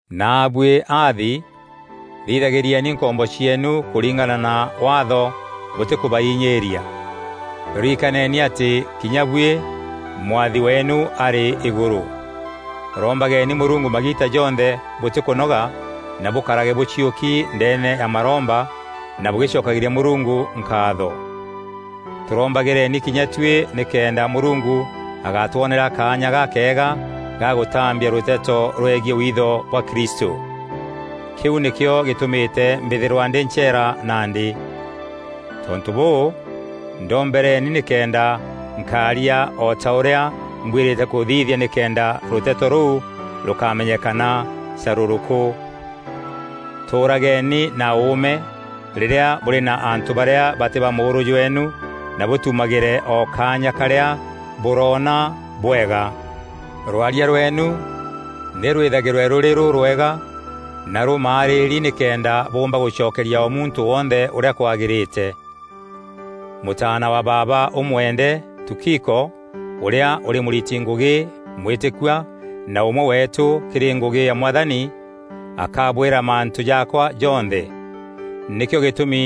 Naabuî aathi, thithagîrieni nkombo cieenu kûringana na Waatho bûtîkûbainyîîria. Rikaneni atî kinya buî Mwathi weenu arî Îgûrû. Rombageni Mûrungu magiita jonthe bûtîkûnoga na bûkarage bûciûki ndeene ya maromba na bûgîcokagîria Mûrungu nkaatho. Tûrombagîreni kinya tuî nîkenda Mûrungu agatwonera kaanya gakeega ga gûtambia rûteto rwegiî witho bwa Kristû. Kîu nîkîo gîtûmîte mbîthîrwa ndî ncheera nandî. Tontû bûû, ndombereni nîkenda nkaaria o ta ûrîa mbwîrîte kûthithia nîkenda rûteto rûu rûkamenyekana carûrûkû. Tûûrageni na ûûme rîrîa bûrî na antû barîa batî ba mûûrû jweenu na bûtumagîre o kaanya karîa bûroona bwega. Rwaria rweenu nî rwîthagîrwe rûrî rûrwega na rûmaarîri nîkenda bûûmba gûcokeria o muntû wonthe ûrîa kwagîrîte. Mûtaana wa baaba ûmwende, Tukiko, ûrîa ûrî mûriti ngûgî mwîtîkîkua na ûmwe weetû kîrî ngûgî ya Mwathani, akabwîra mantû jaakwa jonthe. Nîkîo gîtûmi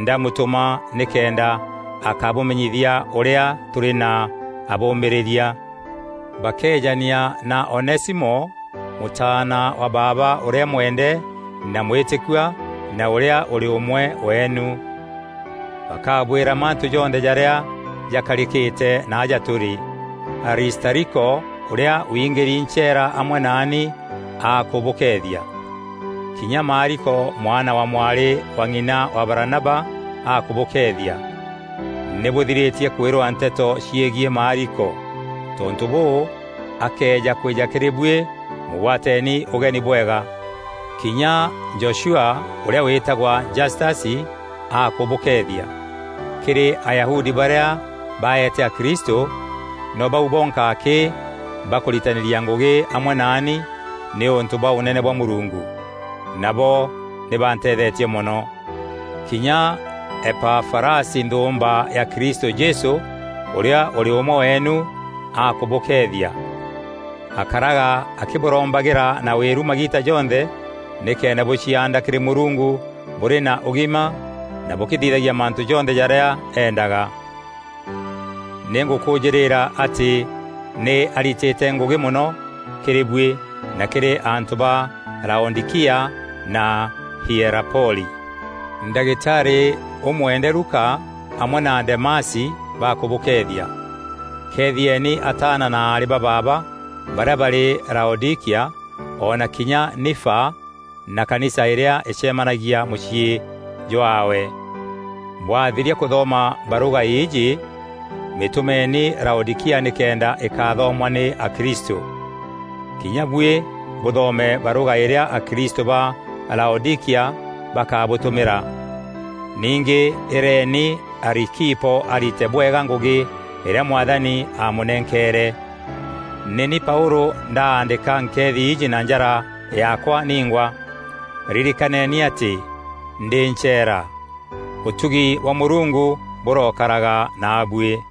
ndamutûma nîkenda akabûmenyithia ûrîa tûrî na abûmîrîria. Bakeejania na Onesimo, mûtaana wa baaba ûrîa mwende na mwîtîkua na ûrîa ûrî ûmwe weenu. Bakabwîra mantû jonthe jarîa jakarîkîte naaja tûrî. Aristariko, ûrîa wiingîri ncheera amwe naani akûbûkeethia. Kinya Maariko mwana wa mwarî wa ng'ina wa Baranaba akûbûkeethia. Nî bûthirîtie kwîrwa nteto cîegiî Maariko. Tontû bûû, akëeja kwîja kîrî buî mûgwateeni ûgeni bwega. Kinya Joshua ûrîa wîtagwa Jastasi akûbûkeethia. Kîrî Ayahudi barîa baete akristû, no bau bonka akî bakûritanîria ngûgî amwe naani nîûntû bwa Ûnene bwa Mûrungu; nabo nî banteethetie mono. Kinya Epafarasi nthûûmba ya Kristû Jesû, ûrîa ûrî ûmwe weenu, akûbûkeethia. Akaraga akîbûrombagîra na wîru magiita jonthe nîkenda bûcianda kîrî Mûrungu bûrî na ûgima na bûkîthithagia mantû jonthe jarîa eendaga. Nî ngûkûjîrîra atî nî aritîte ngûgî mono kîrî buî na kîrî antû ba Laodîkia na Hierapoli. Ndagitarî ûmwende Luka, amwe na Demasi bakûbûkeethia. Keethieni ataana na aarî ba baaba barîa barî Laodîkia, o na kinya Nifa na kanisa îrîa îcemanagia mûciî jaawe. Bwathiria kûthoma barûga îîjî mîtûmeeni Laodîkia nîkenda îkathomwa nî akristû. Kinya buî bûthome barûga îrîa akristû ba Laodîkia bakabûtûmîra. Ningî îreeni Arikipo arite bwega ngûgî îrîa Mwathani aamûnenkeere. Nî ni Paûlû ndaandîka nkeethi iiji na njara yaakwa ningwa. Ririkaneni atî ndî ncheera! Ûtugi bwa Mûrungu bûrookaraga naabuî.